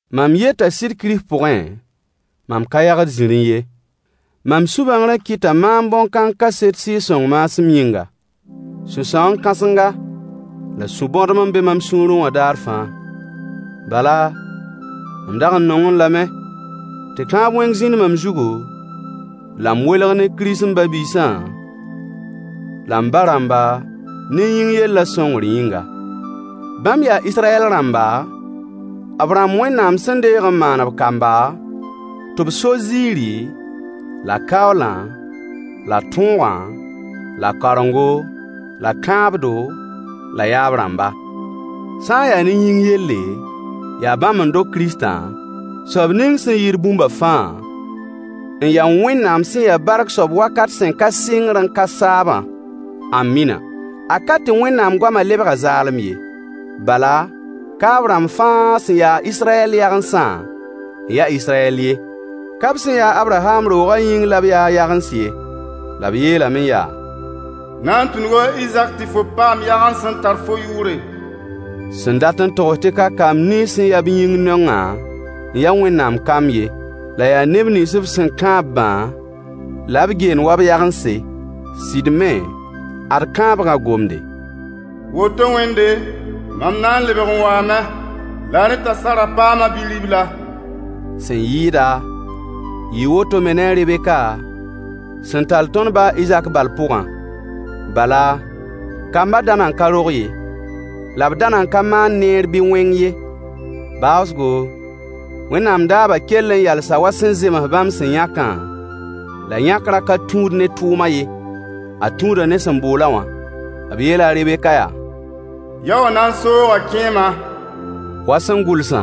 Mam yeta sɩd Kirist pʋgẽ, mam ka yagd zĩri ye. Mam sũ-bãngrã kɩta maam bõn-kãng kaseto, Sɩɩg-sõng maasem yĩnga. Sũ-sãoon-kãsenga, la sũ-bõdem n be mam sũurẽ wã daar fãa. Bala, mam dag n nongẽ lame tɩ kãab wẽng zĩnd mam zugu, la m welg ne Kirist m ba-biisã, la m ba-rãmba ne yĩng yelle, sõngr yĩnga. Bãmb yaa Israyɛl rãmba, b rãmb Wẽnnaam sẽn deeg n maan b kamba tɩ b so ziiri, la kaoolã, la tõogã, la kaorengo, la kãabdo, la yaab-rãmba. Sã n yaa ne yĩng yelle, yaa bãmb n dog Kiristã, soab ning sẽn yɩɩd bũmba fãa, n ya Wẽnnaam sẽn ya bark soab wakat sẽn ka sɩngr n ka saabã. Ãmina! A ka tɩ Wẽnnaam goama lebga zaalem ye. Bala, ka b rãmb fãa sẽn ya a Israyɛl yagensã n ya Israyɛl ye. Ka b sẽn ya a Abraham roogã neb yĩng la b yaa a yagens ye. La b yeelame yaa: Na n tũnuga a Izak tɩ fo paam yagens sẽn tar fo yʋʋre, Sẽn dat n togs tɩ ka kamb nins sẽn ya b yĩng neongã n ya Wẽnnaam kamb ye, la yaa neb nins b kãab-bã la b geend wa b yagense. Sɩd me, ad kãabgã gomde: Woto wẽnde, mam na n lebg n waame, la rẽ t'a Sara paama bi-ribla. Sẽn yɩɩda, yɩɩ woto me ne a Rebeka, sẽn tall tõnd ba a Izak bal pʋgã. Bala, kamba da nan ka rog ye, la b da nan ka maan neer bɩ wẽng ye. Baoosgo, Wẽnnaam daabã kell n yalsame wa sẽn zems bãmb sẽn yãke, la yãkrã ka tũud ne tʋʋmã ye, a tũuda ne sẽn bool-a wã. B yeela a Rebek yaa: Yao wã na n sooga kẽemã, wa sẽn gʋlsa: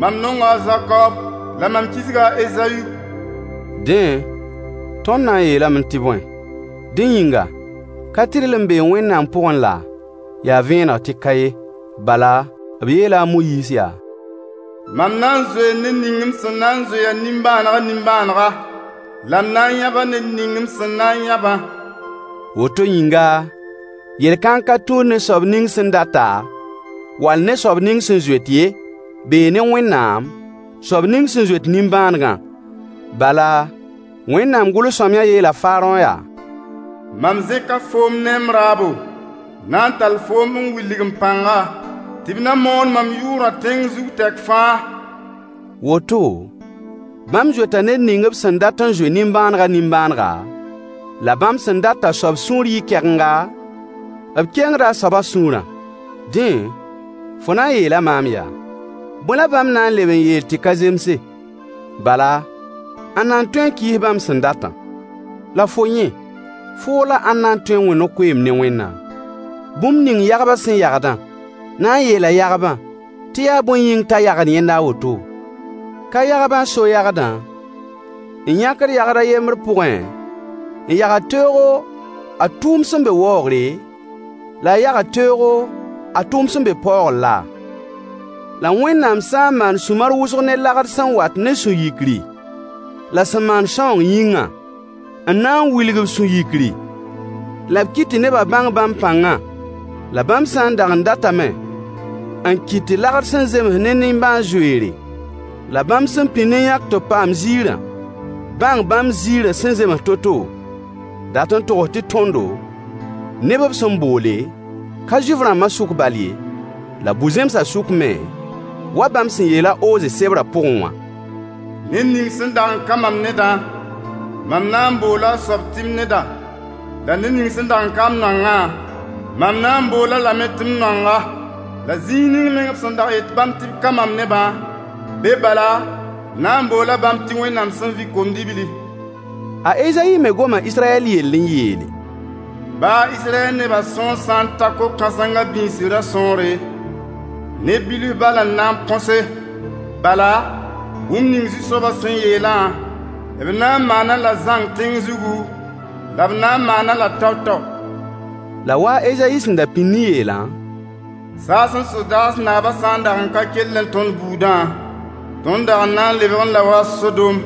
Mam nonga a Zakoob, la mam kisga a Ezayu. Dẽ, tõnd na n yeelame tɩ bõe? Dẽ yĩnga, ka-tɩrlem bee Wẽnnaam pʋgẽ laa? Yaa vẽeneg tɩ ka ye. Bala, b yeela a Moyiis yaa: Mam na n zoee ned ning m sẽn na n zoe a nimbãanegã nimbãanega, la m na kʋma ned ning m sẽn na n kʋmã. Woto yĩnga, yel-kãng ka tũud ne soab ning sẽn data, wall ne soab ning sẽn zoet ye, bee ne Wẽnnaam, soab ning sẽn zoet nimbãanegã. Bala, Wẽnnaam gʋls-sõamyã yeela Faarõ yaa: Mam zẽka foom ne m raabo, n na n tall foom n wilg m pãngã, tɩ b na moon mam yʋʋrã tẽng zug tɛk fãa. Woto, bãmb zoeta ned ning b sẽn dat n zoe a nimbãanegã nimbãanega, la bãmb sẽn dat t'a soab sũur yɩ kɛgenga, b kengda a soabã sũurã. Dẽ, fo na n yeela maam yaa: Bõe la bãmb na n leb n yeel tɩ ka zemse? Bala, ãnna n tõe n kɩɩs bãmb sẽn datã? La fo yẽ, foo la ãnda n tõe n wẽ no-koeemd ne Wẽnnaam? Bũmb ning yagbã sẽn yagdã na n yeela yagbã tɩ yaa bõe yĩng t'a yagd yẽnda a woto? Ka yagbã n so yagdã, n yãkd yagd a yembr pʋgẽ n yagd teoogo a tʋʋm sẽn be waoogre, la a yagd teoogo a tʋʋm sẽn be paoogr la? La Wẽnnaam sã n maan sũ-mar wʋsg ne lagd sẽn wat ne sũ-yikri la sẽn maan sãoong yĩngã, n na n wilg b sũ-yikri la b kɩt tɩ nebã bãng bãmb pãngã? La bãmb sã n dag n datame n kɩt tɩ lagd sẽn zems ne nimbãan-zoeere, la bãmb sẽn pĩnd n yãk tɩ b paam ziirã bãng bãmb ziirã sẽn zems to-to? Dat n togs tɩ tõndo, neb b sẽn boole, ka Zuif-rãmbã sʋk bal ye, la bu-zẽmsã sʋk me, wa bãmb sẽn yeel a Ooze sebrã pʋgẽ wã: Ned ning sẽn dag ka mam nedã, mam na n boola a soab tɩ m neda, la ned ning sẽn dag n ka m noangã, mam na n bool-a lame tɩ m noanga. La zĩig ning meng b sẽn dag n yet bãmb tɩ b ka mam nebã, be bala, b na n boola bãmb tɩ Wẽnnaam sẽn vɩ kom-dibli. A Ezayi me goma Israyɛl yell n yeele: Baa Israyɛl nebã sõor sã n ta ko-kãsengã biisrã sõore, neb bilf bal n na põse. Bala, bũmb ning Zu-soabã sẽn yeelã, b na n maan-a-la zãng tẽng zugu, la b na n maan-a-la tao-tao. La a wa a Ezayi sẽn da pĩnd n yeelã, Saasẽ sodaas naabã sã n dag ka kellẽ tõnd buudã, tõnd dag n na n lebgẽ la wa Sodom,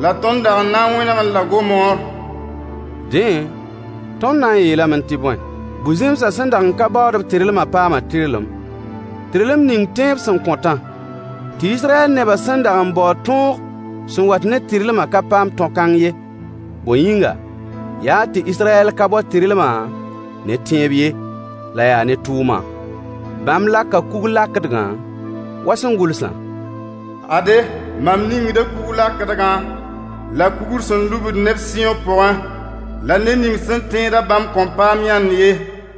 la tõnd dag n na n wẽnegẽ la Gomoor. Dẽ, tõnd na n yeelame tɩ bõe? Bu-zẽmsã, sẽn dag n ka baood-b tɩrlmã paama tɩrlem, tɩrlem ning tẽeb sẽn kõtã. Tɩ Israyɛl nebã sẽn dag n baood tõog sẽn wat ne tɩrlmã ka paam tõ-kãng ye. Bõe yĩnga? Yaa tɩ Israyɛl ka bao tɩrlmã ne tẽeb ye, la yaa ne tʋʋmã. Bãmb laka kug-lakdgã, wa sẽn gʋlsã: Ade, mam ningda kug-lakdgã la kugr sẽn lubd neb sɩyõ pʋgẽ. La ned ning sẽn tẽed-a bãmb kõn paam yãnd ye.